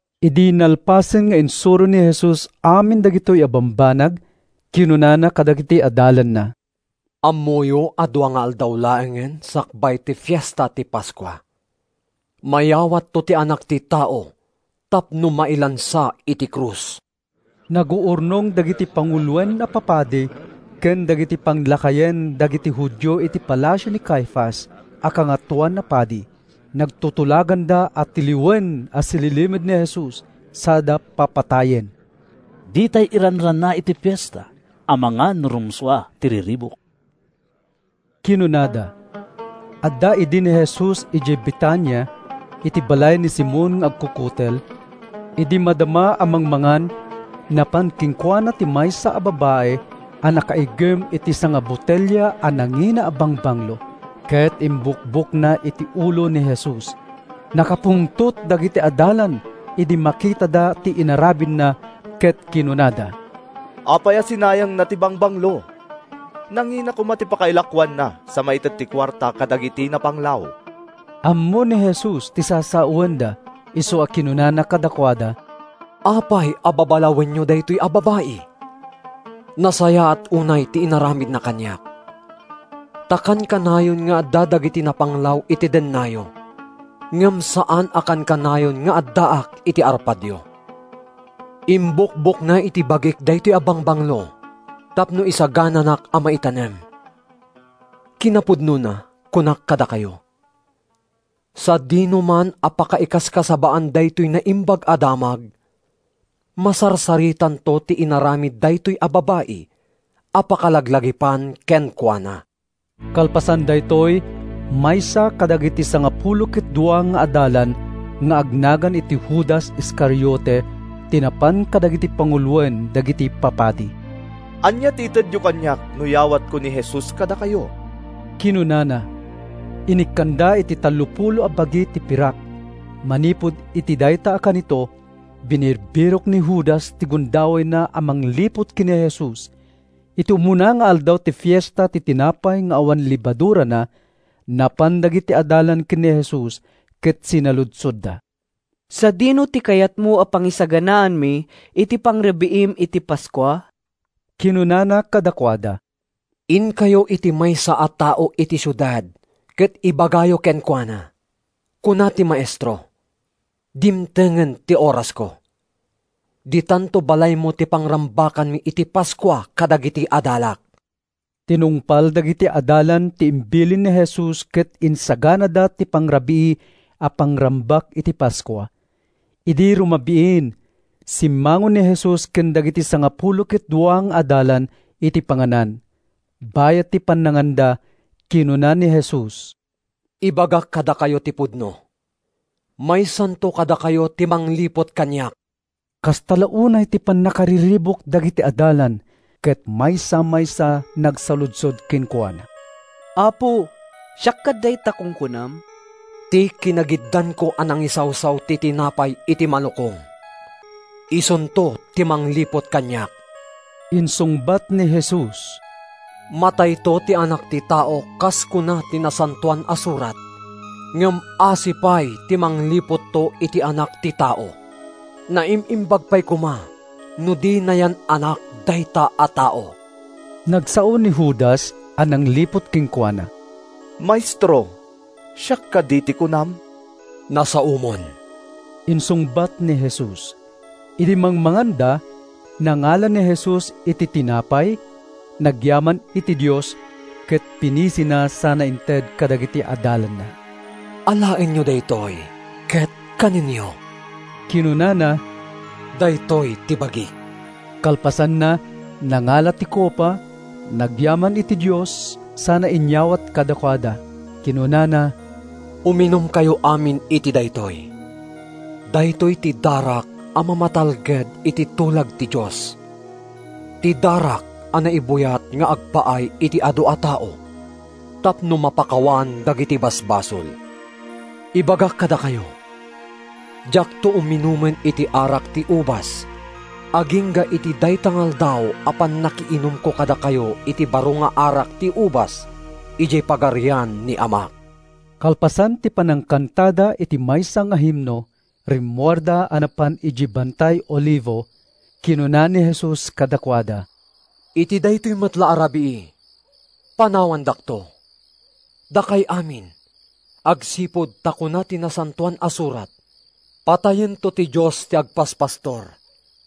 Idi nalpasen nga insuro ni Jesus amin dagitoy a bambanag, kinunana kadagiti adalanna, “Ammoyo a dua nga aldaw laengen sakbay ti Fiesta ti Paskua. Mayawatto ti Anak ti Tao tapno mailansa iti krus.” Naguurnong dagiti panguloen a papadi ken dagiti panglakayen dagiti Judio iti palasio ni Caifas a Kangatoan a Padi. Nagtutulaganda a tiliwen a sililimed ni Jesus sada papatayen. “Ditay iranrana iti fiesta, amangan no rumsua ti riribuk,” kinunada. Adda idi ni Jesus idiay Betania, iti balay ni Simon nga agkukutel. Idi madama a mangmangan, napan kenkuana ti maysa a babai a nakaiggem iti sangabotelia a nangina a bangbanglo, ket imbukbokna iti ulo ni Jesus. Nakapungtot dagiti adalan idi makitada ti inaramidna ket kinunada, “Apay a sinayangna ti bangbanglo? Nangina koma ti pakailakoanna sa maited ti kuarta kadagiti napanglaw!” Ammo ni Jesus ti sasawenda isu a kinunana kadakuada, “Apay a babalawenyo daytoy a babai? Nasayaat unay ti inaramidna kaniak. Ta kankanayon nga adda dagiti napanglaw iti dennayo, ngem saan a kankanayon nga addaak iti arpadyo. Imbukbokna iti bagik daytoy a bangbanglo tapno isagananak a maitanem. Kinapudnona, kunak kadakayo: Sadinoman a pakaikaskasabaan daytoy Naimbag a Damag, masarsaritanto ti inaramid daytoy a babai a pakalaglagipan kenkuana.” Kalpasan daytoy, maysa kadagiti sangapulo ket dua nga adalan nga agnagan iti Judas Iscariote ti napan kadagiti panguloen dagiti papadi. “Ania ti itedyo kaniak no yawatko ni Jesus kadakayo?” kinunana. Inikkanda iti tallopulo a bagi ti pirak. Manipud iti dayta a kanito, binirbirok ni Judas ti gundawayna a mangliput ken Jesus. Iti umuna nga aldaw ti Fiesta ti Tinapay nga awan Lebadurana, napan dagiti adalan ken ni Jesus ket sinaludsodda, “Sadino ti kayatmo a pangisaganaanmi iti pangrabiim iti Paskua?” Kinunana kadakuada, “Inkayo iti maysa a tao iti siudad ket ibagayo kenkuana, ‘Kuna ti Maestro: Dimtengen ti orasko. Ditanto balaymo ti pangrambakanmi iti Paskua kadagiti adalak.’” Tinungpal dagiti adalan ti imbilin ni Jesus ket insaganada ti pangrabii a pangrambak iti Paskua. Idi rumabiin, simmango ni Jesus ken dagiti sangapulo ket dua nga adalan iti panganan. Bayat ti pannanganda, kinuna ni Jesus, “Ibagak kadakayo ti pudno: maysanto kadakayo ti mangliput kaniak.” Kasta unay ti pannakariribuk dagiti adalan ket maysa-maysa nagsaludsod kenkuana, “Apo, siak kad dayta kunkunam?” “Ti kinagiddanko a nangisawsaw ti tinapay iti malukong, isunto ti mangliput kaniak,” insungbat ni Jesus. “Matayto ti Anak ti Tao kas kuna ti Nasantoan a Surat, ngem asi pay ti mangliputto iti Anak ti Tao! Naim-imbag pay koma no di nayan-anak dayta a tao.” Nagsao ni Judas a nangliput kenkuana: “Maestro, siak kadi ti kunam?” “Nasaomon!” insungbat ni Jesus. Idi mangmanganda, nangala ni Jesus iti tinapay, nagyaman iti Dios, ket pinisina sana inted kadagiti adalanna. “Alaenyo daytoy ket kanenyo,” kinunana. “Daytoy ti bagik.” Kalpasanna, nangala iti kopa, nagyaman iti Dios, sana inyawat kadakuada. Kinunana, “Uminumkayo amin iti daytoy; daytoy ti darak a mamatalged iti tulag ti Dios, ti darak a naibuyat nga agpaay iti adu a tao, tapno mapakawan dagiti basbasol. Ibagak kadakayo: Diakto uminumen iti arak ti ubas agingga iti dayta nga aldaw a pannakiinumko kadakayo iti baro nga arak ti ubas idiay Pagarian ni Amak.” Kalpasan ti panangkantada iti maysa nga himno, rimmuarda a napan idiay Bantay Olivo. Kinuna ni Jesus kadakuada, “Iti daytoy met la a rabii, panawandakto, dakay amin, agsipud ta kuna ti Nasantoan a Surat, ‘Patayento ti Dios ti agpaspastor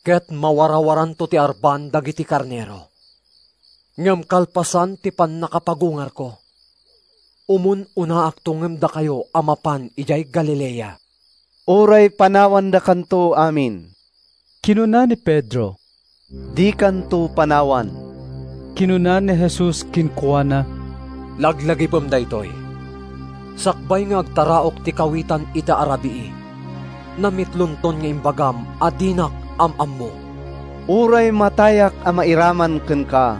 ket mawarawaranto ti arban dagiti karnero.’ Ngem kalpasan ti pannakapagungarko, umun-unaakto ngem dakayo a mapan idiay Galilea.” “Uray panawandakanto amin,” kinuna ni Pedro, “dikanto panawan.” Kinuna ni Jesus kenkuana, “Laglagipem daytoy: Sakbay nga agtaraok ti kawitan ita a rabii, namitlonton nga imbagam a dinak am-ammo!” “Uray matayak a mairaman kenka,”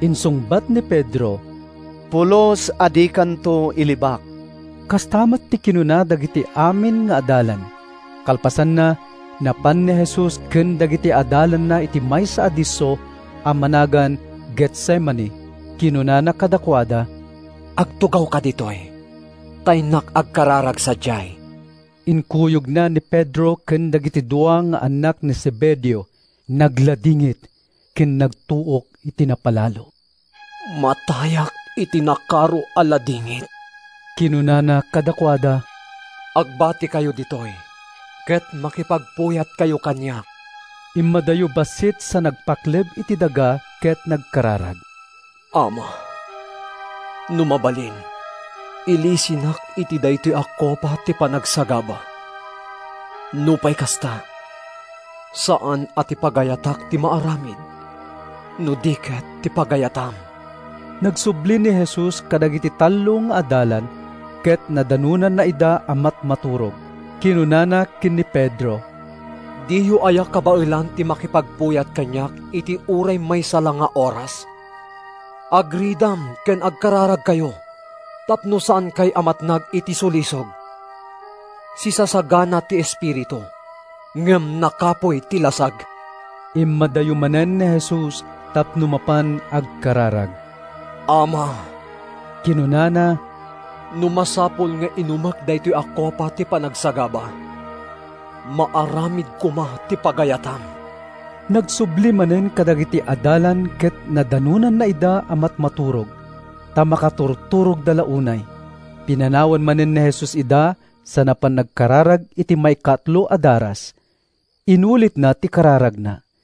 insungbat ni Pedro, “pulos a dikanto ilibak.” Kasta met ti kinuna dagiti amin nga adalan. Kalpasanna, napan ni Jesus ken dagiti adalanna iti maysa a disso a managan Getsemani. Kinunana kadakuada: “Agtugawkayo ditoy, ta innak agkararag sadiay.” Inkuyogna ni Pedro ken dagiti dua nga annak ni Zebedeo. Nagladingit ken nagtuok iti napalalo. “Matayak iti nakaro a ladingit,” kinunana kadakuada. “Agbatikayo ditoy ket makipagpuyatkayo kaniak.” Immadayo bassit sa nagpakleb iti daga ket nagkararag: “Ama, no mabalin, ilisinak iti daytoy a kopa ti panagsagaba. Nupay kasta, saan a ti pagayatak ti maaramid no di ket ti pagayatam.” Nagsubli ni Jesus kadagiti tallo nga adalan ket nadanonna ida a matmaturog. Kinunana ken ni Pedro: “Diyo aya kabaelan ti makipagpuyat kaniak iti uray maysa la nga oras? Agridam ken agkararagkayo tapno saankay a matnag iti sulisog. Sisasagana ti espiritu, ngem nakapuy ti lasag.” Immadayo manen ni Jesus tapno mapan agkararag. “Ama,” kinunana, “no masapul nga inumek daytoy a kopa ti panagsagaba, maaramid koma ti pagayatam.” Nagsubli manen kadagiti adalan ket nadanonna ida a matmaturog, ta makaturturogda la unay. Pinanawan manen ni Jesus ida sa napan nagkararag iti maikatlo a daras. Inulitna ti kararagna.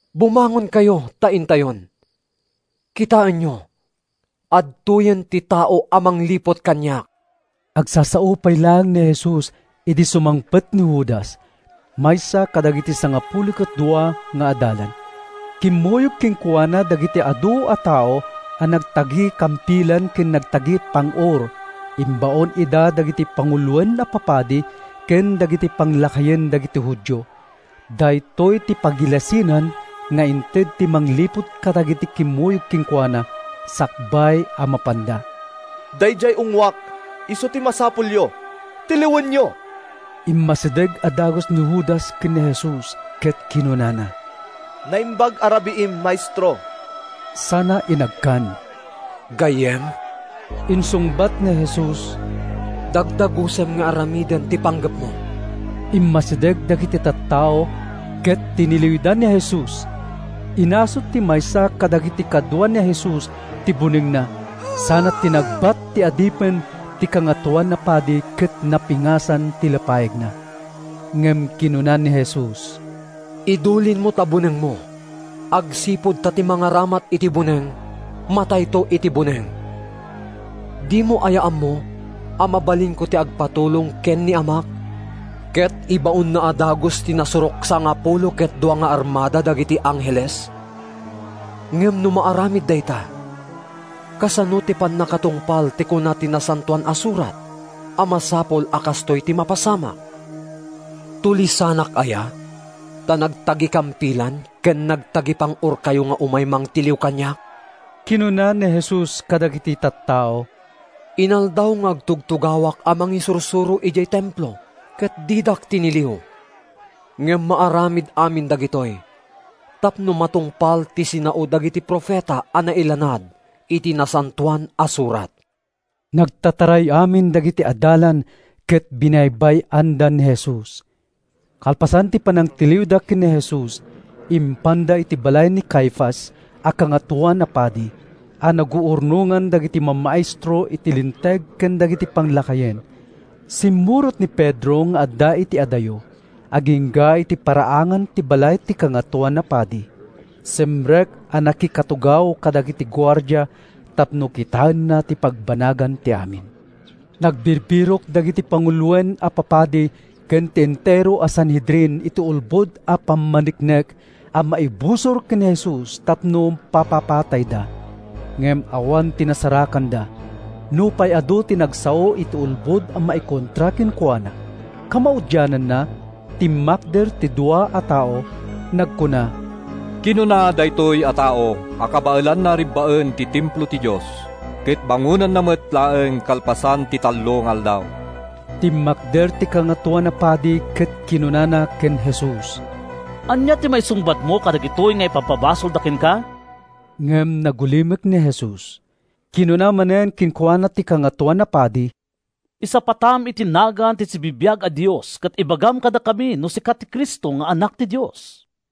Bumangonkayo ta intayon. Kitaenyo, adtoyen ti tao a mangliput kaniak.” Agsasao pay laeng ni Jesus idi sumangpet ni Judas, maysa kadagiti sangapulo ket dua nga adalan. Kimmuyog kenkuana dagiti adu a tao a nagtagikampilan ken nagtagipang-or. Imbaon ida dagiti panguloen a papadi ken dagiti panglakayen dagiti Judio. Daytoy ti pagilasinan nga inted ti mangliput kadagiti kimmuyog kenkuana sakbay a mapanda: “Daydiay ungngoak isu ti masapulyo. Tiliwenyo!” Immasideg a dagus ni Judas ken ni Jesus ket kinunana, “Naimbag a rabiim, Maestro,” sana inagkan. “Gayyem,” insungbat ni Jesus, “dagdagusem nga aramiden ti panggepmo!” Immasideg dagiti tattao, ket tiniliwda ni Jesus. Inasut ti maysa kadagiti kadua ni Jesus ti bunengna sana tinagbat ti adipen ti Kangatoan a Padi ket napingasan ti lapayagna. Ngem kinuna ni Jesus, “Idulinmo ta bunengmo agsipud ta ti mangaramat iti buneng matayto iti buneng. Dimo aya ammo a mabalinko ti agpatulong ken ni Amak ket ibaonna a dagus ti nasurok a sangapulo ket dua nga armada dagiti angheles? Ngem no maaramid dayta, kasano ti pannakatungpal ti kuna ti Nasantoan a Surat a masapul a kastoy ti mapasamak?” “Tulisanak aya, ta nagtagikampilan ken nagtagipang-orkayo nga umay mangtiliw kaniak?” kinuna ni Jesus kadagiti tattao. “Inaldaw nga agtugtugawak a mangisursuro idiay Templo ket didak tiniliw. Ngem maaramid amin dagitoy tapno matungpal ti sinao dagiti profeta a nailanad iti Nasantoan a Surat.” Nagtataray amin dagiti adalan ket binaybay-anda ni Jesus. Kalpasan ti panangtiliwda ken ni Jesus, impanda iti balay ni Caifas a Kangatoan a Padi, a naguurnongan dagiti mamaestro iti Linteg ken dagiti panglakayen. Simmurot ni Pedro nga adda iti adayo, agingga iti paraangan ti balay ti Kangatoan a Padi. Simrek a nakikatugaw kadagiti guardia tapno kitaenna ti pagbanagan ti amin. Nagbirbirok dagiti panguloen a papadi ken ti entero a Sanhedrin iti ulbod a pammaneknek a maibusor ken Jesus tapno papapatayda. Ngem awan ti nasarakanda, nupay adu ti nagsao iti ulbod a maikontra kenkuana. Kamaudiananna, timmakder ti dua a tao a nagkuna, “Kinuna daytoy a tao a kabaelanna a rebbaen ti Templo ti Dios, ket bangonenna met laeng kalpasan ti tallo nga aldaw.” Timmakder ti Kangatoan a Padi ket kinunana ken Jesus, “Ania ti maisungbatmo kadagitoy nga ipabpabasolda kenka?” Ngem nagulimek ni Jesus. Kinuna manen kenkuana ti Kangatoan a Padi, “Isapatam iti nagan ti sibibiag a Dios ket ibagam kadakami no sika ti Cristo nga Anak ti Dios.”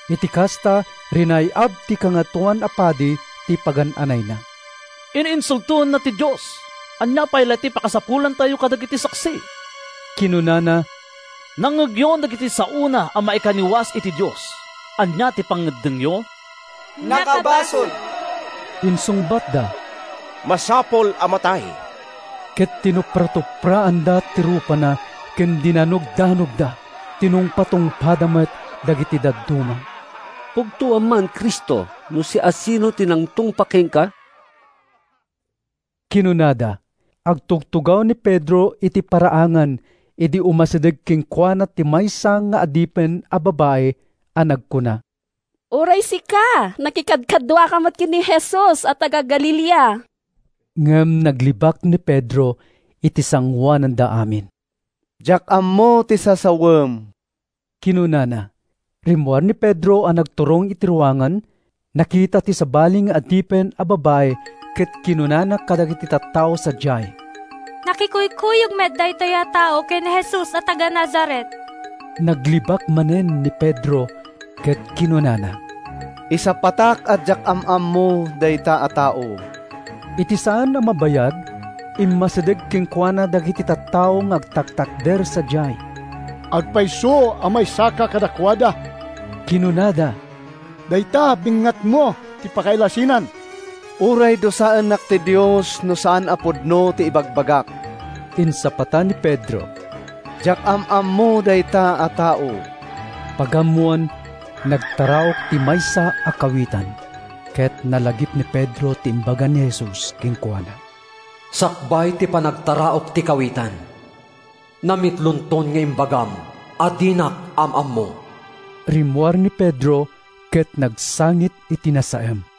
Iti kasta, rinay-ab ti Kangatoan a Padi ti pagan-anayna. “In-insultoenna ti Dios! Ania pay la ti pakasapulantayo kadagiti saksi?” kinunana. “Nangngegyon dagiti saona a maikaniwas iti Dios. Ania ti pangngeddengyo?” “Nakabasol,” insungbatda. “Masapul a matay!” Ket tinupratupraanda ti rupana ken dinanogdanogda. Tinungpatungpa met dagiti dadduma. “Pugtoam man, Cristo, no siasino ti nangtungpa kenka?” kinunada. Agtugtugaw ni Pedro iti paraangan idi umasideg kenkuana ti maysa nga adipen a babai a nagkuna: “Uray sika, nakikadkaduaka met ken ni Jesus a taga-Galilea.” Ngem naglibak ni Pedro iti sangoananda amin. “Diak ammo ti sasawem,” kinunana. Rimmuar ni Pedro a nagturong iti ruangan. Nakita ti sabali nga adipen a babai ket kinunana kadagiti tattao sadiay, “Nakikuykuyog met daytoy a tao ken ni Jesus a taga-Nazaret.” Naglibak manen ni Pedro ket kinunana: “Isapatak a diak am-ammo dayta a tao.” Iti saan a mabayag, immasideg kenkuana dagiti tattao nga agtatakder sadiay. “Agpayso a maysaka kadakuada,” kinunada. “Dayta bengngatmo ti pakailasinan.” “Uray dusaennak ti Dios no saan a pudno ti ibagbagak!” insapata ni Pedro. “Diak am-ammo dayta a tao.” Pagammoan, nagtaraok ti maysa a kawitan, ket nalagip ni Pedro ti imbaga ni Jesus kenkuana: “Sakbay ti panagtaraok ti kawitan, namitlonton nga imbagam a dinak am-ammo!” Rimmuar ni Pedro ket nagsangit iti nasaem.